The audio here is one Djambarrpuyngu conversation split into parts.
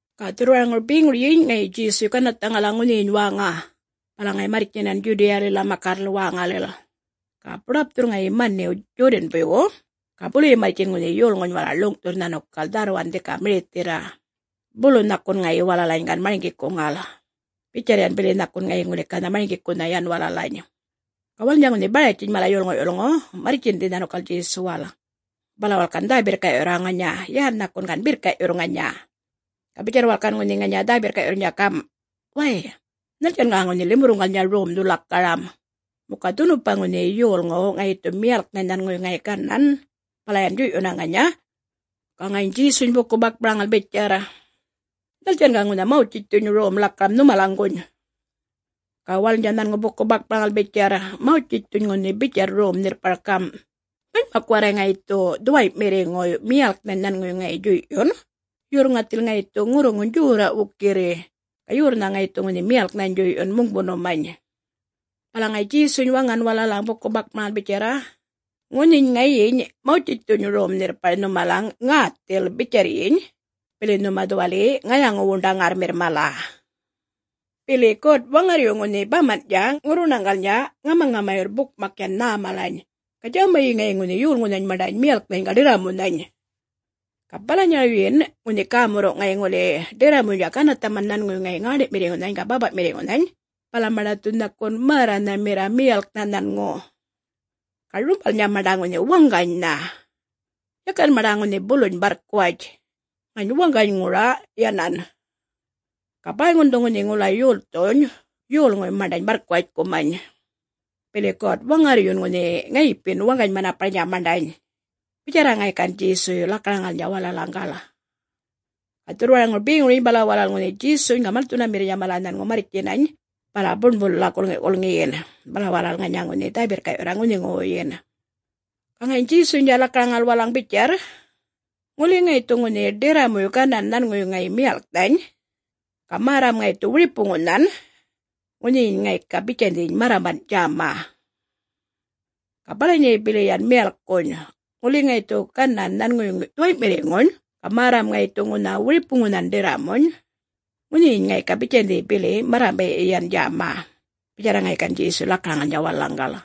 Ga dhurrwaraŋur beŋuryiny ŋayi Djesuy ganarrthaŋala ŋunhiyiny wäŋa, bala ŋayi marrtjinan Djudiyalila makarrlil wäŋalil, ga buḏapthurr ŋayi maniw Djodanbuywu, ga buluyi marrtjin ŋunhi yolŋuny walal ḻuŋ'thurr nhanukal dharrwan dhika mirithirra, bulu nhakun ŋayi walalany gan marŋgikuŋal, bitjarr yan bili nhakun ŋayi ŋuli ganha marŋgikunha yan walalany. Ga walalnydja ŋunhi Baratjiny mala yolŋu'-yulŋu marrtjindhi nhanukal Djesuwal, bala walal gan dhä-birrka'yurra ŋanya, yan nhakun gan birrka'yurr ŋanya. Ga bitjarr walal gan ŋanya ŋunhi dhä-birrka'yurrnydja gam', “Way, nhaltjan ga ŋunhi limurruŋgalnydja romdhu lakaram? … Muka dhunupa ŋunhi yolŋuw ŋayi dhu miyalknhany nhanŋuwuy ŋayi ganan, bala yan djuy'yunna ŋanya?” Ga ŋayiny Djesuny buku-bakmaraŋal bitjarr, “Nhaltjan ga ŋunhi Mawtjitjthuny rom ḻakaraŋal nhumalaŋguny?” Ga walalnydja nhanŋu buku-bakmaraŋal bitjarr, “Mawtjitjthuny ŋunhi bitjarr rom nhirrpar gam', manymak warray ŋayi dhu dhuway'mirriŋuy miyalknhany nhanŋuwuy ŋayi djuy'yun, yurr ŋathil ŋayi dhu ŋurruŋuny djorra' wukirri, ga yorrnha ŋayi dhu ŋunhi miyalknhany djuy'yun muŋbunumany.” Bala ŋayi Djesuny waŋan walalaŋ buku-bakmaraŋal bitjarra, “Ŋunhiny ŋayiny Mawtjitjthuny rom nhirrpar nhumalaŋ ŋäthil bitjarryiny, bili nhuma dhuwali ŋayaŋu-wuṉḏaŋarrmirr mala. Bili God-Waŋarryu ŋunhi baman'tja ŋurruṉaŋgalnydja ŋamaŋamayurr bukmak yan nhä malany, ga djämayi ŋayi ŋunhi yolŋunhany maṉḏany miyalknhany ga ḏirramunhany. Ga balanyarawyin ŋunhi gämurruw' ŋayi ŋuli ŋunhi ḏirramuynydja ganarrthaman nhanŋuwuy ŋayi ŋäṉḏi'mirriŋunhany ga bäpa'mirriŋunhany, bala maṉḏa dhu nhakun märranhamirra miyalknha nhanŋu. Ga rumbalnydja maṉḏa ŋunhi waŋganynha. Yakan maṉḏa ŋunhi buluny barrkuwatj, ŋany waŋganyŋura yanan. Ga bäyŋun dhu ŋunhi ŋula yolthuny yolŋuy maṉḏany barrkuwatjkumany, bili God-Waŋarryun ŋunhi ŋayipin waŋgany-manaparnydja maṉḏany,” bitjarra ŋayi gan Djesuy lakaraŋalnydja walalaŋgal. Ga dhurrwaraŋur beŋuryiny bala walal ŋunhi Djesuny ga malthunamirrnydja mala nhanŋu marrtjinany bala buṉbulila gulŋi'-gulŋiyin, bala walal ŋanya ŋunhi dhä-birrka'yurra ŋunhiŋuwuyyin. Ga ŋayiny Djesuynydja lakaraŋal walalaŋ bitjarr, “Ŋuli ŋayi dhu ŋunhi ḏirramuy ganan nhanŋuwuy ŋayi miyalknhany, ga märram ŋayi dhu wiripuŋunhan, ŋunhiyiny ŋayi ga bitjandhiny marramban' djäma. Ga balanyayi bili yan miyalkkuny, ŋuli ŋayi dhu ganan nhanŋuwuy ŋayi dhuway'mirriŋuny ga märram ŋayi dhu ŋunha wiripuŋunhan ḏirramuny, ŋunhiyiny ŋayi ga bitjandhi bili yan marramba'yi yan djäma,” bitjarra ŋayi gan Djesuy lakaraŋalnydja walalaŋgal.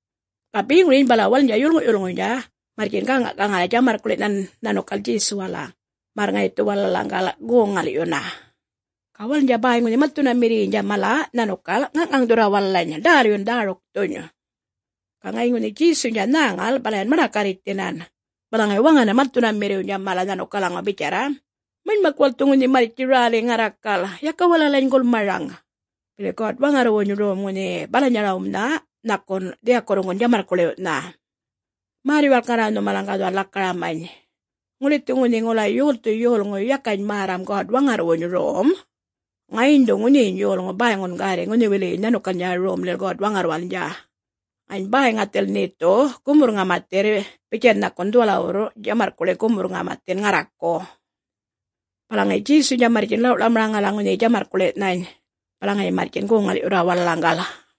Ga beŋuryiny bala walalnydja yolŋu'-yulŋuynydja marrtjin gäŋa'-gaŋal djamarrkuḻi'nhan nhanukal Djesuwala, märr ŋayi dhu walalaŋgal goŋ-ŋal'yun. Ga walalnydja bäy ŋunhi malthunamirriynydja mala nhanukal ŋaŋ'ŋaŋ'thurra walalany ḏälyun dhärukthuny. Ga ŋayiny ŋunhi Djesuynydja nhäŋal, bala yan maḏakarritjthinan, bala ŋayi waŋanan malthunamirriwnydja mala nhanukalaŋaw bitjarra, “Manymak walal dhu ŋunhi marrtji räli ŋarrakal, yaka walalany gulmaraŋ. Bili God-Waŋarrwuny rom ŋunha balanyarawnha nhakun dhiyakurruŋgun djamarrkuḻiw'nha.” Märr-yuwalk ŋarra nhumalaŋ ga dhuwal lakaramany. Ŋuli dhu ŋunhi ŋula yolthu yolŋuy yakany märram God-Waŋarrwuny Rom, ŋayiny dhu ŋunhiyiny yolŋu bäyŋun gärri ŋunhiwiliyiny nhanukalnydja Romlil God-Waŋarrwalnydja, ŋany bäy ŋathil nhe dhu gumurr-ŋamathirr bitjan nhakun dhuwalawurr djamarrkuḻi' gumurr-ŋamathin ŋarraku. Bala ŋayi Djesuynydja marrtjin ḻaw'-ḻawmaraŋala ŋunhiyiny djamarrkuḻi'nhany, bala ŋayi marrtjin goŋ-ŋal'yurra walalaŋgal.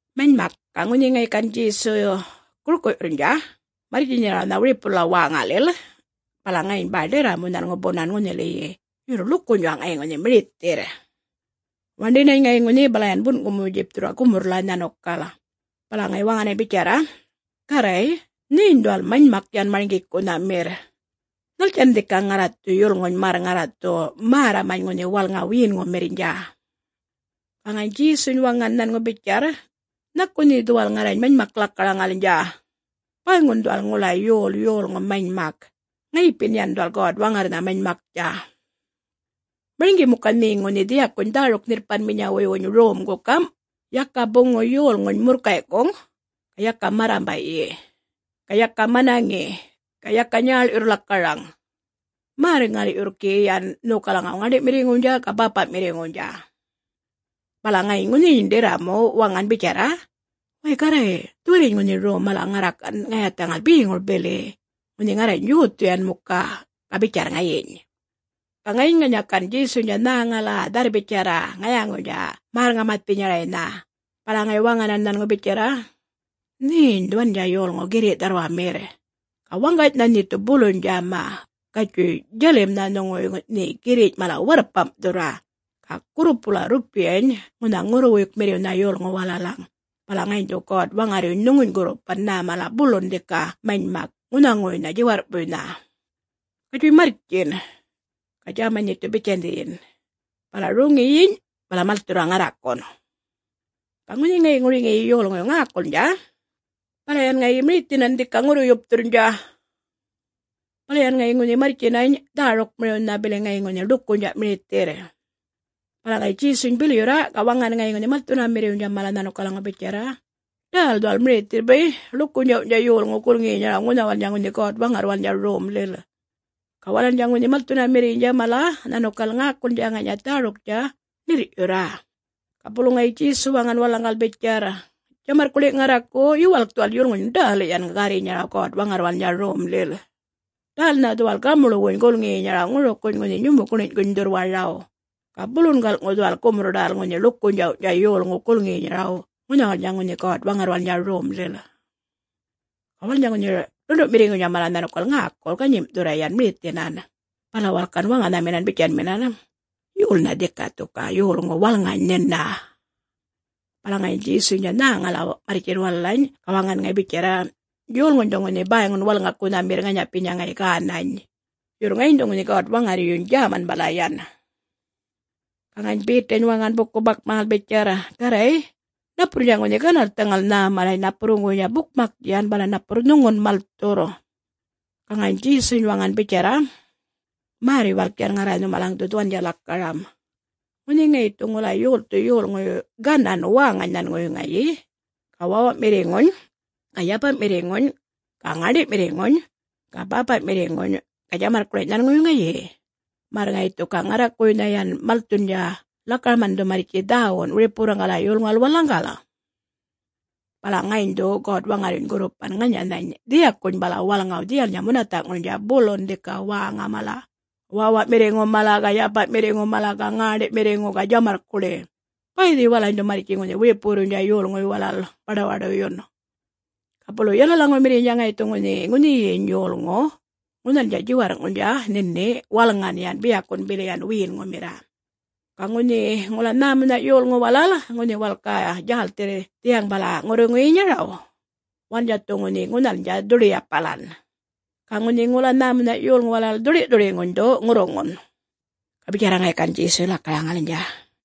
Manymak, ga ŋunhi ŋayi gan Djesu gurku'yurrnydja marrtjinyarawnha wiripulila wäŋalil, bala ŋayiny bäy ḏirramu nhanŋu bunan ŋunhiliyi, yurr ḻukunydja' ŋayi ŋunhi mirithirr. Waṉḏinany ŋayi ŋunhi bala yan bun'kumu-djipthurra gumurrlila nhanukal, bala ŋayi waŋanany bitjarra, “Garray nheny dhuwal manymak yan marŋgikunhamirr. Nhaltjan dhika ŋarra dhu yulŋuny märr ŋarra dhu märramany ŋunhi walŋa wiyinŋumirrnydja?” Ga ŋayiny Djesuny waŋan nhanŋu bitjarr, “Nhaku nhe dhuwal ŋarrany manymak lakaraŋalnydja? Bäyŋun dhuwal ŋula yol yolŋu manymak; ŋayipin yan dhuwal God-Waŋarrnha manymaktja. Marŋgi muka nhe ŋunhi dhiyakuny dhäruk-nhirrpanminyawuywuny romgu gam', ‘Yaka buŋu yolŋuny murrkay'kuŋ, ga yaka marramba'yi, ga yaka manaŋi, ga yaka nyäḻyurr lakaraŋ. Märr-ŋal'yurr gi yan nhokalaŋaw ŋäṉḏi'mirriŋuwnydja ga bäpa'mirriŋuwnydja.’” Bala ŋayiny ŋunhiyiny ḏirramuny waŋan bitjarra, “Way Garray dhuwaliyiny ŋunhi rom mala ŋarra gan ŋayathaŋal beŋur bili, ŋunhi ŋarrany yothu yan muka,” ga bitjarr ŋayiny. Ga ŋayiny ŋanya gan Djesuynydja nhäŋala dharr-bitjarra ŋayaŋuynydja märr-ŋamathinyaraynha, bala ŋayi waŋanan nhanŋu bitjarra, “Nheny dhuwandja yolŋu girri' dharrwamirr, ga waŋganynha nhe dhu buluny djäma. Gatjuy djalimnha nhuŋuwuy nhe girriny' mala warrpam'thurra, ga gurrupula rrupiyany ŋunha ŋurruwuykmirriwnha yolŋuw walalaŋ, bala ŋayiny dhu God-Waŋarryuny nhuŋuny gurrupan nhä mala bulun dhika manymak ŋunhaŋuwuynha djiwarr'puynha. Gatjuy marrtjin, ga djämany nhe dhu bitjandhiyin, bala roŋiyiny, bala malthurra ŋarrakun.” Ga ŋunhi ŋayi ŋuriŋiyi yolŋuy ŋäkulnydja, bala yan ŋayi mirithinan dhika ŋurru-yupthurrnydja, bala yan ŋayi ŋunhi marrtjinany dhärukmiriwnha, bili ŋayi ŋunhi ḻukunydja' mirithirr. Bala ŋayi Djesuny bilyurra, ga waŋan ŋayi ŋunhi malthunamirriwnydja mala nhanukalaŋaw bitjarra, “Ḏäl dhuwal mirithirr bay', ḻukunydjawny'tja yolŋuw gulŋiyinyaraw ŋunhawalnydja ŋunhi God-Waŋarrwalnydja Romlil.” Ga walalnydja ŋunhi malthunamirriynydja mala nhanukal ŋäkulnydja ŋanya dhäruktja ṉirr'yurra. Ga bulu ŋayi Djesu waŋan walalaŋgal bitjarr, “Djamarrkuḻi' ŋarraku, yuwalk dhuwal yulŋuny ḏäl yan gärrinyaraw God-Waŋarrwalnydja Romlil! Ḏälnha dhuwal gamuḻwuny gulŋiyinyaraw ŋurukuny ŋunhi nyumukiny'kuny dhurrwaraw, ga bulun gal'ŋu dhuwal gumurr-ḏäl ŋunhi ḻukunydjawny'tja yolŋuw gulŋiyinyaraw ŋunhawalnydja ŋunhi God-Waŋarrwalnydja Romlil.” Ga walalnydja ŋunhi ḻundu'mirriŋuynydja mala nhanukal ŋäkul ganyim'thurra yan mirithinan, bala walal gan waŋanhaminan bitjanminan, “Yolnha dhika dhu ga yolŋu walŋany nhina?” Bala ŋayiny Djesuynydja nhäŋala marrtjin walalany ga waŋan ŋayi bitjarra, “Yolŋuny dhu ŋunhi bäyŋun walŋakunhamirr ŋanyapinya ŋayi gänany. Yurr ŋayiny dhu ŋunhi God-Waŋarryuny djäman bala yan.” Ga ŋayiny Betany waŋan buku-bakmaraŋal bitjarr, “Garray napurrnydja ŋunhi ganarrthaŋal nhä malany ŋanapurruŋguwuynydja bukmak yan, bala napurr nhuŋun malthurr.” Ga ŋayiny Djesuny waŋan bitjarra, “Märr-yuwalk yan ŋarra nhumalaŋ dhu dhuwandja lakaram. Ŋunhi ŋayi dhu ŋula yolthu yolŋuy ganan wäŋany nhanŋuwuy ŋayi, ga wäwa'mirriŋuny, ga yapa'mirriŋuny, ga ŋäṉḏi'mirriŋuny, ga bäpa'mirriŋuny, ga djamarrkuḻiny' nhanŋuwuy ŋayi, märr ŋayi dhu ga ŋarrakuwuynha yan malthundja lakaraman dhu marrtji dhäwun wiripuwurruŋgala yolŋuwal walalaŋgal, bala ŋayiny dhu God-Waŋarryuny gurrupan ŋanyanhany dhiyakuny bala walŋaw dhiyalnydja munatha'ŋurnydja, bulun dhika wäŋa mala, wäwa'mirriŋu mala, ga yapa'mirriŋu mala, ga ŋäṉḏi'mirriŋu, ga djamarrkuḻi'. Bäydhi walalany dhu marrtji ŋunhi wiripuwurruynydja yolŋuy mala baḏuwaḏuyun. Ga bulu yalalaŋumirriynydja ŋayi dhu gi ŋunhi ŋunhiyiny yolŋu ŋunhalnydja djiwarr'ŋurnydja nhini walŋan yan, biyakun bili yan wiyinŋumirra. Ga ŋunhi ŋula nhämunha yolŋu walal, ŋunhi walal ga djälthirr dhiyaŋ bala ŋurruŋuyinyaraw, walalnydja dhu ŋunhi ŋunhalnydja dhuḏi-yapalan, ga ŋunhi ŋula nhämunha' yolŋu walal dhuḏi'-dhuḏiŋuny dhu ŋurruŋun.” Ga bitjarra ŋayi gan Djesuy lakaraŋalnydja.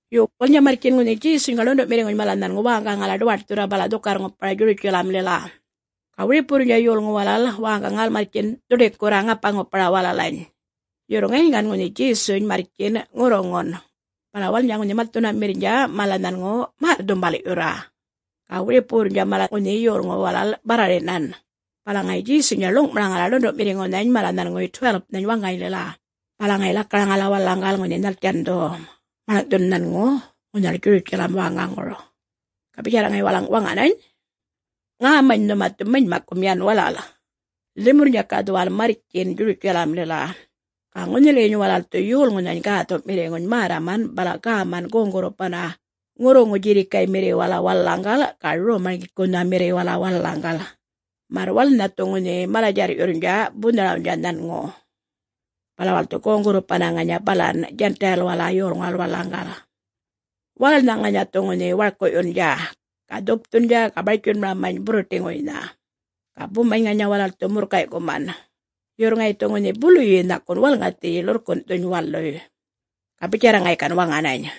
Yo. Walalnydja marrtjin ŋunhi Djesuny ga ḻundu'mirriŋuny mala nhanŋu wäŋgaŋala ḏuwaṯthurra balan dhukarr-ŋupara Djurutjalamlila. Ga wiripuwurrnydja yolŋu walal wäŋgaŋal marrtjin dhuḏikurra, ŋapa-ŋupara walalany. Yurr ŋayiny gan ŋunhi Djesuny marrtjin ŋurruŋun, bala walalnydja ŋunhi malthunamirrnydja mala nhanŋu märr-dhumbal'yurra, ga wiripuwurrnydja mala ŋunhi yolŋu walal barrarinan. Bala ŋayi Djesuynydja ḻuŋ'maraŋala ḻundu'mirriŋunhany mala nhanŋuwuy 12-nhany waŋganylila, bala ŋayi lakaraŋala walalaŋgal ŋunhi nhaltjan dhu maḻŋ'thun nhanŋu ŋunhal Djurutjalam wäŋaŋur. Ga bitjarra ŋayi walalaŋ waŋanany, “Ŋämany nhuma dhu manymakkum yan walal. Limurrnydja ga dhuwal marrtjin Djurutjalamlil, ga ŋunhiliyiny walal dhu Yolŋunhany Gäthu'mirriŋuny märraman bala gäman goŋ-gurrupanna ŋurruŋu djirrikaymirriwala walalaŋgal ga Rom-marŋgikunhamirriwala walalaŋgal, märr walalnha dhu ŋunhi mala-djarr'yundja bunharawnydja nhanŋu, bala walal dhu goŋ-gurrupanna ŋanya balan Djan'tayilwala yolŋuwal walalaŋgal. Walalnha ŋanya dhu ŋunhi warku'yundja, ga dhupthundja ga bartjunmaramany burruṯiŋuynha, ga bumany ŋanya walal dhu murrkay'kuman. Yurr ŋayi dhu ŋunhi buluyi nhakun walŋathiyi ḻurrkun'thuny waluy.” Ga bitjarra ŋayi gan ŋunhi waŋanany.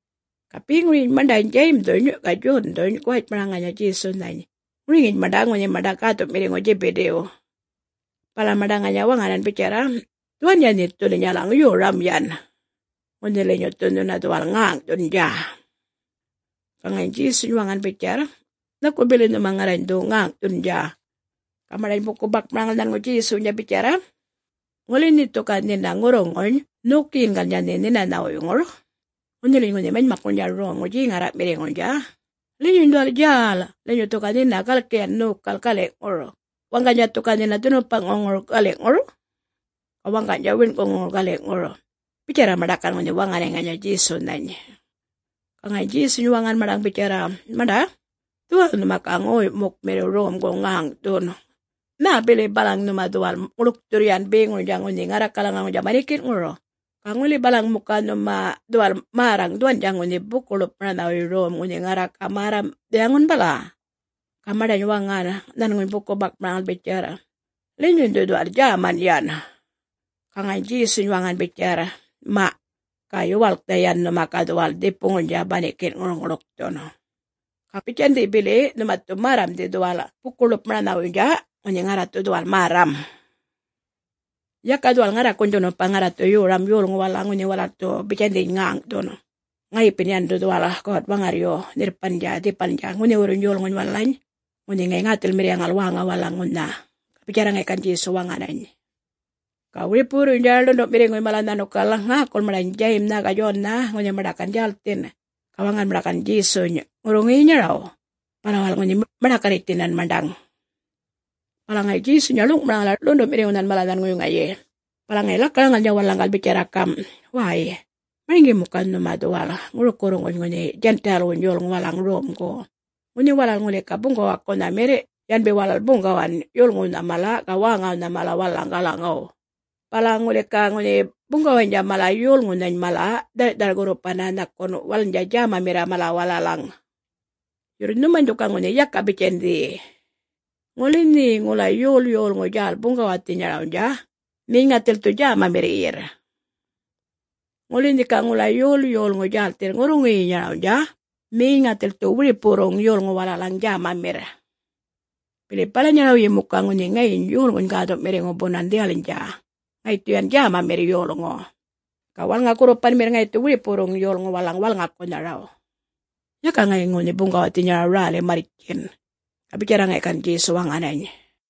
Ga beŋuryiny, maṉḏany Djayimdhuny ga Djondhuny guwatjmara ŋanya Djesunhany, ŋuriŋiny maṉḏa ŋunhi maṉḏa gäthu'mirriŋu Djibidiw. Bala maṉḏa ŋanya waŋanan bitjarra, “Dhuwandja nhe dhu linyalaŋ yoram yan, ŋunhi linyu dhu nhuna dhuwal ŋäŋ'thundja.” Ga ŋayiny Djesuny waŋan bitjarr, “Nhaku bili nhuma ŋarrany dhu ŋäŋ'thundja?” Ga maṉḏany buku-bakmaraŋal nhanŋuny Djesuwnydja bitjarra, “Ŋunhi nhe dhu ga nhina ŋurruŋuny nhokiyingalnydja nhe nhinanhawuyŋur, ŋunhiliyiny ŋunhi manymakŋurnydja romŋur djeŋarra'mirriŋurnydja, linyuny dhuwal djäl linyu dhu ga nhina galki yan nhokal gali'ŋur, waŋganydja dhu ga nhina dhunupa'ŋuŋur gali'ŋur, ga waŋganydja wiṉ'kuŋuŋur gali'ŋur.” Bitjarra maṉḏa gan ŋunhi waŋanany ŋanya Djesunhany. Ga ŋayiny Djesuny waŋan maṉḏaŋ bitjarr, “Maṉḏa, dhuwal nhuma ga ŋoy'mukmirriw romgu ŋäŋ'thun. Nhä bili balaŋ nhuma dhuwal ŋuḻkthurr yan beŋurnydja ŋunhi ŋarrakalaŋuŋurnydja banikin'ŋur. Ga ŋula balaŋ muka nhuma dhuwal märraŋ dhuwandja ŋunhi buku-ḻupmaranhawuy rom ŋunhi ŋarra ga märram dhiyaŋun bala?” Ga maṉḏany waŋan, nhanŋuny buku-bakmaraŋal bitjarr, “Linyuny dhu dhuwal djäman yan.” Ga ŋayiny Djesuny waŋan bitjarr, “Ma! Ga yuwalknha yan nhuma dhu dhuwal dhipuŋurnydja banikin'ŋur ŋuḻkthun, ga bitjandhi bili nhuma dhu märramdhi dhuwal buku-ḻupmaranhawuynydja, ŋunhi ŋarra dhu dhuwal märram. Yaka dhuwal ŋarrakuny dhunupa, ŋarra dhu yoram yolŋuw walalaŋ ŋunhi walal dhu bitjandhiyiny ŋäŋ'thun. Ŋayipi yan dhu dhuwal God-Waŋarryu nhirrpandja dhipalnydja ŋunhiwurruny yolŋuny walalany ŋunhi ŋayi ŋäthilmirriyaŋal wäŋa walalaŋ ŋunha.” Ga bitjarra ŋayi gan ŋunhi Djesu waŋanany. Ga wiripuwurruynydja ḻundu'mirriŋuy mala nhanukal ŋäkul maṉḏany Djayimnha ga Djonnha ŋunhi maṉḏa gan djälthin, ga waŋan maṉḏa gan Djesuny ŋurruŋuyinyaraw, bala walal ŋunhi maḏakarritjthinan maṉḏaŋ. Bala ŋayi Djesuynydja ḻuŋ'maraŋala ḻundu'mirriŋunhany mala nhanŋuwuy ŋayi, bala ŋayi lakaraŋalnydja walalaŋgal bitjarra gam', “Way, marŋgi muka nhuma dhuwal ŋurukuwurruŋguny ŋunhi Djan'tayilwuny yolŋuw walalaŋ romgu, ŋunhi walal ŋuli ga buŋgawakunhamirr, yanbi walal buŋgawan yolŋuwnha mala ga wäŋawnha mala walalaŋgalaŋaw. Bala ŋuli ga ŋunhi buŋgawaynydja mala yolŋunhany mala dhar'thar-gurrupanna, nhakun walalnydja djämamirra mala walalaŋ. Yurr nhumany dhu ga ŋunhi yaka bitjandhi. Ŋuli nhe ŋula yol yolŋu djäl buŋgawayinyarawnydja, nheny ŋathil dhu djämamirriyirr. Ŋuli nhe ga ŋula yol yolŋu djälthirr ŋurruŋuyinyarawnydja, nheny ŋathil dhu wiripuwurruŋguny yolŋu walalaŋ djämamirr. Bili balanyarawyi muka ŋunhi ŋayiny Yolŋuny Gäthu'mirriŋu bunan dhiyalnydja, ŋayi dhu yan djämamirr yolŋu, ga walŋa-gurrupanmirr ŋayi dhu wiripuwurruŋ yolŋuw walalaŋ walŋakunharaw. Yaka ŋayi ŋunhi buŋgawathinyarawnydja räli marrtjin.” Ga bitjarra ŋayi gan ŋunhi Djesu waŋanany.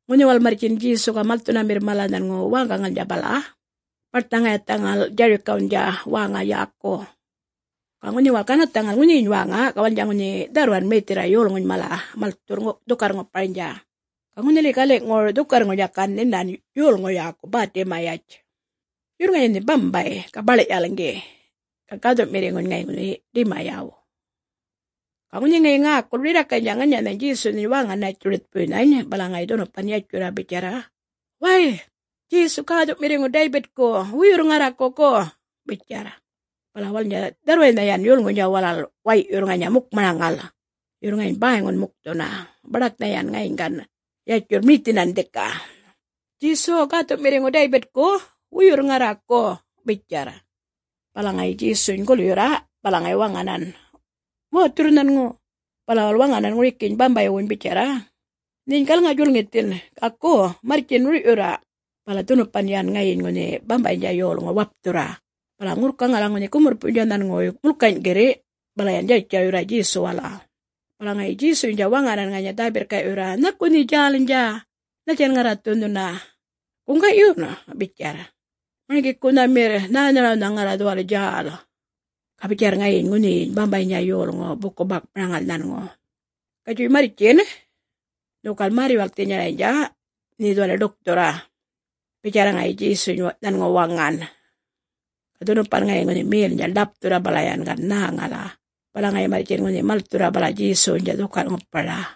Ŋunhi walal marrtjin Djesu ga malthunamirr mala nhanŋu wäŋgaŋalnydja bala-a-a, baṯnha ŋayathaŋal Djarikawnydja wäŋa yäku. Ga ŋunhi walal ganarrthaŋal ŋunhiyiny wäŋa, ga walalnydja ŋunhi dharrwan mirithirra yolŋuny mala malthurr dhukarr-ŋuparnydja. Ga ŋunhili gali'ŋur dhukarrŋurnydja gan nhinan yolŋu yäku Bätimayatj, yurr ŋayi ŋunhi bambay ga baḻ'-yalŋgi, ga gäthu'mirriŋuny ŋayi ŋunhi Dimayaw. Ga ŋunhi ŋayi ŋäkul rirrakaynydja ŋanyanhany Djesunhany wäŋa Nätjuritjpuynhany bala ŋayi dhunupan yatjurra bitjarra, “Way, Djesu Gäthu'mirriŋu Daybitku, wuyurr ŋarraku go,” bitjarr. Bala walalnydja dharrwaynha yan yolŋuynydja mala way'yurr ŋanya mukmaraŋal, yurr ŋayiny bäyŋun mukthunna; baḏaknha yan ŋayiny gan yatjurr mirithinan dhika, “Djesu, gäthu'mirriŋu Daybitku, wuyurr ŋarraku,” bitjarr. Bala ŋayi Djesuny gulyurra, bala ŋayi waŋanan, “Wäthurr nhanŋu.” Bala walal waŋanan ŋurikiyiny bambaywuny bitjarra, “Nheny galŋa-djulŋithin, ga go marrtjin rur'yurra.” Bala dhunupan yan ŋayiny ŋunhi bambaynydja yolŋu wapthurra bala ŋurrkaŋala ŋunhi gumurrpuynydja nhanŋuwuy mulkany' girri', bala yan djartjaryurra Djesuwala. Bala ŋayi Djesuynydja waŋanan ŋanya dhä-birrka'yurra, “Nhaku nhe djälnydja? Nhaltjan ŋarra dhu nhuna, … guŋga'yun?” bitjarr. “Marŋgikunhamirr nhänharawnha ŋarra dhuwal djäl,” ga bitjarr ŋayiny ŋunhiyiny bambaynydja yolŋu buku-bakmaraŋal nhanŋu. “Gatjuy marrtjin. Nhokal märr-yuwalkthinyaraynydja nhe dhuwali ḏukthurra,” bitjarra ŋayi Djesuny nhanŋu waŋan. Ga dhunupan ŋayi ŋunhi melnydja ḻapthurra bala yan ŋayi nhäŋala, bala ŋayi marrtjin ŋunhi malthurra bala Djesuwnydja dhukarr-ŋupara.